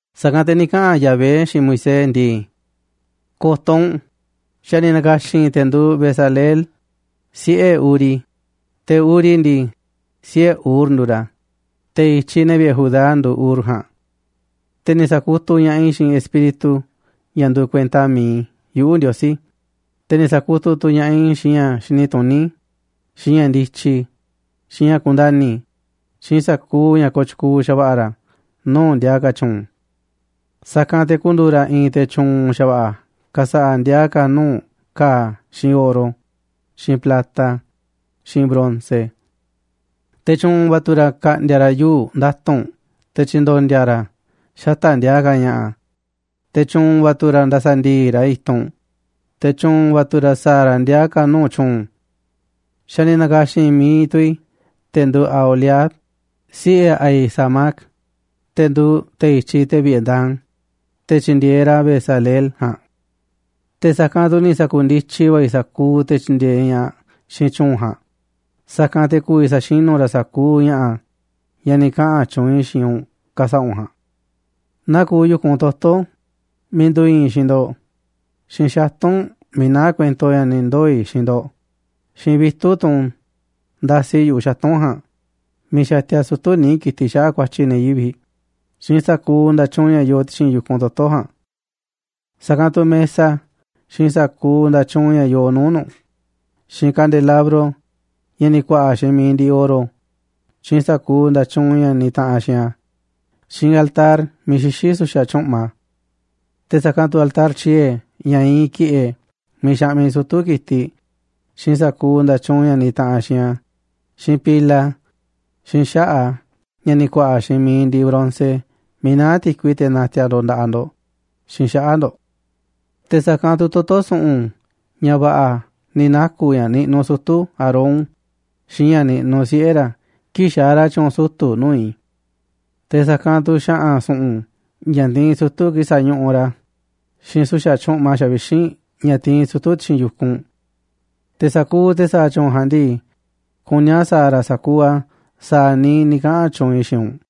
Sa̱kanꞌ te̱ ni̱ kaꞌa̱n Yahvé xiinꞌ Moisés ndii: ―Ko̱to̱ u̱nꞌ, xa̱ ni̱ na̱ka̱xi̱n i̱ te̱ nduuꞌ Bezaleel, siꞌe̱ Uri, te̱ Uri ndii, siꞌe̱ Hur nduuꞌ ra̱, te̱ i̱tyiꞌ ne̱ vi̱ꞌe̱ Judá nduuꞌ Hur ja̱a̱nꞌ. Te̱ ni̱ sa̱kutuꞌ ña̱ꞌaꞌ i̱ xiinꞌ Espíritu ña̱ nduuꞌ kuenta mi̱iꞌ yuꞌu̱, Ndiosí, te̱ ni̱ sa̱kutuꞌ tu̱ ña̱ꞌaꞌ i̱ xiinꞌ ña̱ xini tuní, xiinꞌ ña̱ ndityi, xiinꞌ ña̱ kundani̱, xiinꞌ sa̱kuuꞌ ña̱ kooꞌ tyukuuꞌ xa̱va̱ꞌa̱ ra̱ nuu̱ꞌ ndiaa ka̱ tyu̱u̱n. Sa̱kanꞌ te̱ ku̱ndu̱u̱ ra̱ i̱i̱n te̱ tyu̱u̱n xa̱va̱ꞌa̱ ka̱sa̱ꞌa̱ ndiaa ka̱ nuu̱ꞌ ka̱a̱ xiinꞌ oro, xiinꞌ plata, xiinꞌ bronce. Te̱ tyu̱u̱n va̱ tu̱ ra̱ ka̱ꞌndi̱a̱ ra̱ yuu̱ꞌ nda̱tu̱nꞌ te̱ tyi̱ndo̱ndi̱a̱ ra̱ a̱ xata̱ꞌ ndiaa ka̱ ña̱ꞌa̱, te̱ tyu̱u̱n va̱ tu̱ ra̱ nda̱sa̱ndi̱i̱ꞌ ra̱ i̱tunꞌ, te̱ tyu̱u̱n va̱ tu̱ ra̱ sa̱a̱ ra̱ ndiaa ka̱ nuu̱ꞌ tyu̱u̱n. Xa̱ ni̱ na̱ka̱xi̱n mi̱iꞌ tu̱ i̱ te̱ nduuꞌ Aholiab, siꞌe̱ Ahisamac, te̱ nduuꞌ te̱ i̱tyiꞌ ne̱ vi̱ꞌe̱ Dan, te̱ tyi̱ndi̱e̱eꞌ ra̱ Bezaleel ja̱a̱nꞌ. Te̱ sa̱kanꞌ tu̱ ni̱ sa̱ku̱ndityi va̱ i̱ sa̱kuuꞌ te̱ tyi̱ndi̱e̱eꞌ ña̱ꞌaꞌ xiinꞌ tyu̱u̱n ja̱a̱nꞌ, sa̱kanꞌ te̱ ku̱vi̱ sa̱xinu̱ ra̱ sa̱kuuꞌ ña̱ꞌa̱, ña̱ ni̱ kaꞌa̱n tyuunꞌ i̱ xiinꞌ u̱nꞌ ka̱sa̱ꞌa̱ u̱nꞌ ja̱a̱nꞌ. Naa kuuꞌ yu̱kunꞌ toto̱ miiꞌ nduuꞌ iinꞌ i̱ xiinꞌ ndo̱ꞌ, xiinꞌ xatu̱nꞌ miiꞌ naá kuento ña̱ ni ndoo̱ꞌ i̱ xiinꞌ ndo̱ꞌ, xiinꞌ vitu̱ꞌ, tunꞌ ndasi yu̱ꞌuꞌ xatu̱nꞌ ja̱a̱nꞌ miiꞌ xatia sutu̱ níiꞌ ki̱tiꞌ xaꞌa̱ꞌ ku̱a̱tyi̱ ne̱ yivi̱ꞌ, xiinꞌ sa̱kuuꞌ nda̱tyuunꞌ ña̱ yoo ti̱xi̱n yu̱kunꞌ toto̱ ja̱a̱nꞌ. Sa̱kanꞌ tu̱ mesa xiinꞌ sa̱kuuꞌ nda̱tyuunꞌ ña̱ yoo nuu̱ꞌ nu̱ꞌ, xiinꞌ kandelabro ña̱ ni̱ ku̱a̱ꞌa̱ xiinꞌ mi̱iꞌ ndiꞌiꞌ oro, xiinꞌ sa̱kuuꞌ nda̱tyuunꞌ ña̱ nitaꞌanꞌ xiinꞌ a̱, xiinꞌ altar miiꞌ xixí su̱xa̱ tyu̱ꞌma. Te̱ sa̱kanꞌ tu̱ altar tyie̱ ña̱ iinꞌ ki̱ꞌe̱ miiꞌ xaꞌmiꞌ sutu̱ ki̱tiꞌ, xiinꞌ sa̱kuuꞌ nda̱tyuunꞌ ña̱ nitaꞌanꞌ xiinꞌ a̱, xiinꞌ pila, xiinꞌ xaꞌa̱ꞌ a̱ ña̱ ni̱ ku̱a̱ꞌa̱ xiinꞌ mi̱iꞌ ndiꞌiꞌ bronce miiꞌ naá ti̱kui teꞌ natiaꞌ ndo̱ꞌ nda̱ꞌaꞌ ndo̱ꞌ xiinꞌ xaꞌa̱ꞌ ndo̱ꞌ. Te̱ sa̱kanꞌ tu̱ toto̱ su̱ꞌu̱n ña̱ va̱ꞌa̱ ni̱ naku̱ ña̱ niꞌnuꞌ sutu̱ Aarón xiinꞌ ña̱ niꞌnuꞌ siꞌe̱ ra̱ kii̱ꞌ xaaꞌ ra̱ tyu̱u̱n sutu̱ nuu̱ꞌ i̱. Te̱ sa̱kanꞌ tu̱ xa̱ꞌa̱n su̱ꞌu̱n ña̱ tiinꞌ sutu̱ kii̱ꞌ sa̱ñuꞌuꞌ ra̱, xiinꞌ su̱xa̱ tyu̱ꞌma xavixínꞌ ña̱ tiinꞌ sutu̱ ti̱xi̱n yu̱kunꞌ. Te̱ sa̱kuuꞌ te̱ sa̱a̱ tyu̱u̱n ja̱a̱nꞌ ndii, kuní a̱ sa̱a̱ ra̱ a̱ sa̱kuuꞌ a̱ sa̱a̱ niiꞌ ni̱ kaꞌa̱n tyuunꞌ i̱ xiinꞌ u̱nꞌ.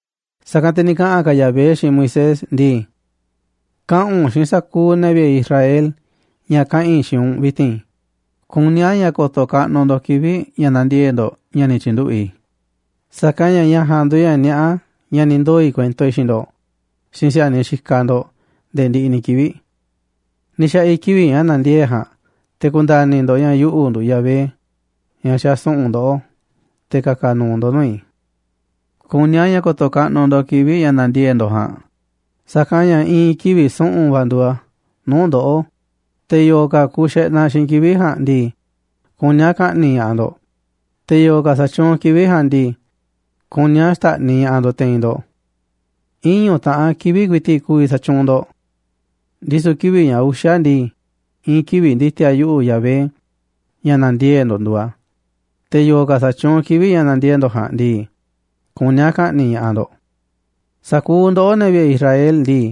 Sa̱kanꞌ te̱ ni̱ kaꞌa̱n ka̱ Yahvé xiinꞌ Moisés ndii: ―Kaꞌa̱n u̱nꞌ xiinꞌ sa̱kuuꞌ ne̱ vi̱ꞌe̱ Israel ña̱ kaꞌa̱n i̱ xiinꞌ u̱nꞌ vi̱ti̱n: “Kuní a̱ ña̱ ko̱to̱ kaꞌnuꞌ ndo̱ꞌ kivi̱ꞌ ña̱ nandiee̱ꞌ ndo̱ꞌ ña̱ ni̱ tyi̱nduꞌu̱ i̱, sa̱kanꞌ ña̱ ña̱ ja̱a̱nꞌ nduuꞌ ña̱ niaꞌá ña̱ ni̱ ndoo̱ i̱ kuento i̱ xiinꞌ ndo̱ꞌ xiinꞌ si̱a̱niꞌ xikaꞌ ndo̱ꞌ nde̱e̱ ndiꞌiꞌ ni̱ kivi̱ꞌ. Ni̱ xa̱ꞌa̱ i̱ kivi̱ꞌ ña̱ nandiee̱ꞌ ja̱a̱nꞌ te̱ ku̱nda̱ni̱ ndo̱ꞌ ña̱ yuꞌu̱ nduuꞌ Yahvé, ña̱ xasu̱ꞌu̱n ndoꞌó te̱ ka̱ka̱ nu̱u̱ ndo̱ꞌ nuu̱ꞌ i̱. Kuní a̱ ña̱ ko̱to̱ kaꞌnuꞌ ndo̱ꞌ kivi̱ꞌ ña̱ nandiee̱ꞌ ndo̱ꞌ ja̱a̱nꞌ, sa̱kanꞌ ña̱ i̱i̱n kivi̱ꞌ su̱ꞌu̱n va̱ nduuꞌ a̱ nuu̱ꞌ ndoꞌó, te̱ yo̱o̱ ka̱ ku̱u̱ xeꞌnaꞌ xiinꞌ kivi̱ꞌ ja̱a̱nꞌ ndii, kuní a̱ ka̱ꞌni̱ꞌ ña̱ꞌaꞌ ndo̱ꞌ, te̱ yo̱o̱ ka̱ sa̱tyuunꞌ kivi̱ꞌ ja̱a̱nꞌ ndii, kuní a̱ xta̱ꞌniꞌ ña̱ꞌaꞌ ndo̱ꞌ te̱i̱n ndo̱ꞌ. Iñu̱ taꞌan kivi̱ꞌ ku̱i̱ti̱ꞌ ku̱vi̱ sa̱tyuunꞌ ndo̱ꞌ, ndisu̱ kivi̱ꞌ ña̱ uxa̱ ndii, i̱i̱n kivi̱ꞌ ndi̱ti̱a̱ yuꞌu̱, Yahvé, ña̱ na̱ndiee̱ꞌ ndo̱ꞌ nduuꞌ a̱. Te̱ yo̱o̱ ka̱ sa̱tyuunꞌ kivi̱ꞌ ña̱ nandiee̱ꞌ ndo̱ꞌ ja̱a̱nꞌ ndii, kuní a̱ ka̱ꞌni̱ꞌ ña̱ꞌaꞌ ndo̱ꞌ. Sa̱kuuꞌ ndoꞌó, ne̱ vi̱ꞌe̱ Israel ndii,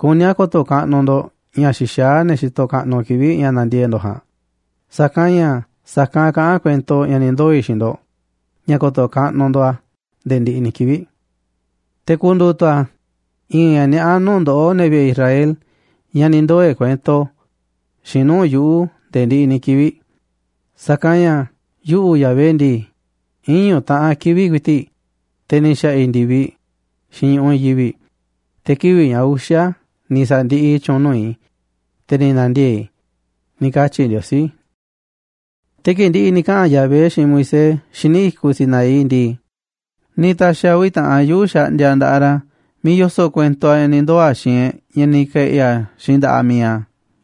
kuní a̱ ko̱to̱ kaꞌnuꞌ ndo̱ꞌ ña̱ xixaá ne̱ xitoꞌ kaꞌnuꞌ kivi̱ꞌ ña̱ nandiee̱ꞌ ndo̱ꞌ ja̱a̱nꞌ, sa̱kanꞌ ña̱ sa̱kanꞌ kaꞌán kuento ña̱ ni̱ ndoo̱ i̱ xiinꞌ ndo̱ꞌ, ña̱ ko̱to̱ kaꞌnuꞌ ndo̱ꞌ a̱ nde̱e̱ ndiꞌiꞌ ni̱ kivi̱ꞌ. Te̱ ku̱ndu̱u̱ tu̱ a̱ i̱i̱n ña̱ niaꞌá nuu̱ꞌ ndoꞌó, ne̱ vi̱ꞌe̱ Israel, ña̱ ni ndoo̱ꞌ e̱ꞌ kuento xiinꞌ nuu̱ꞌ yuꞌu̱ nde̱e̱ ndiꞌiꞌ ni̱ kivi̱ꞌ. Sa̱kanꞌ ña̱ yuꞌu̱, Yahvé ndii, iñu̱ taꞌan kivi̱ꞌ ku̱i̱ti̱ꞌ, te̱ ni̱ xa̱ꞌa̱ i̱ ndi̱viꞌ xiinꞌ ñu̱ꞌuꞌ i̱i̱n yivi̱ꞌ, te̱ kivi̱ꞌ ña̱ uxa̱ ni̱ sa̱ndiꞌiꞌ i̱ tyu̱u̱n nuu̱ꞌ i̱, te̱ ni̱ na̱ndiee̱ꞌ i̱” ―ni̱ katyi̱ Ndiosí. Te̱ kii̱ꞌ ndi̱ꞌi̱ ni̱ kaꞌa̱n Yahvé xiinꞌ Moisés xíniꞌ i̱kuꞌ Sinaí ndii, ni̱ ta̱xi̱ a̱ uvi̱ taꞌan yuu̱ꞌ xaꞌndiaꞌ nda̱ꞌaꞌ ra̱ miiꞌ yoso̱ꞌ kuento a̱ ña̱ ni̱ ndoo̱ xiinꞌ e̱ꞌ, ña̱ ni̱ ke̱ꞌi̱ a̱ xiinꞌ nda̱ꞌaꞌ mi̱iꞌ a̱.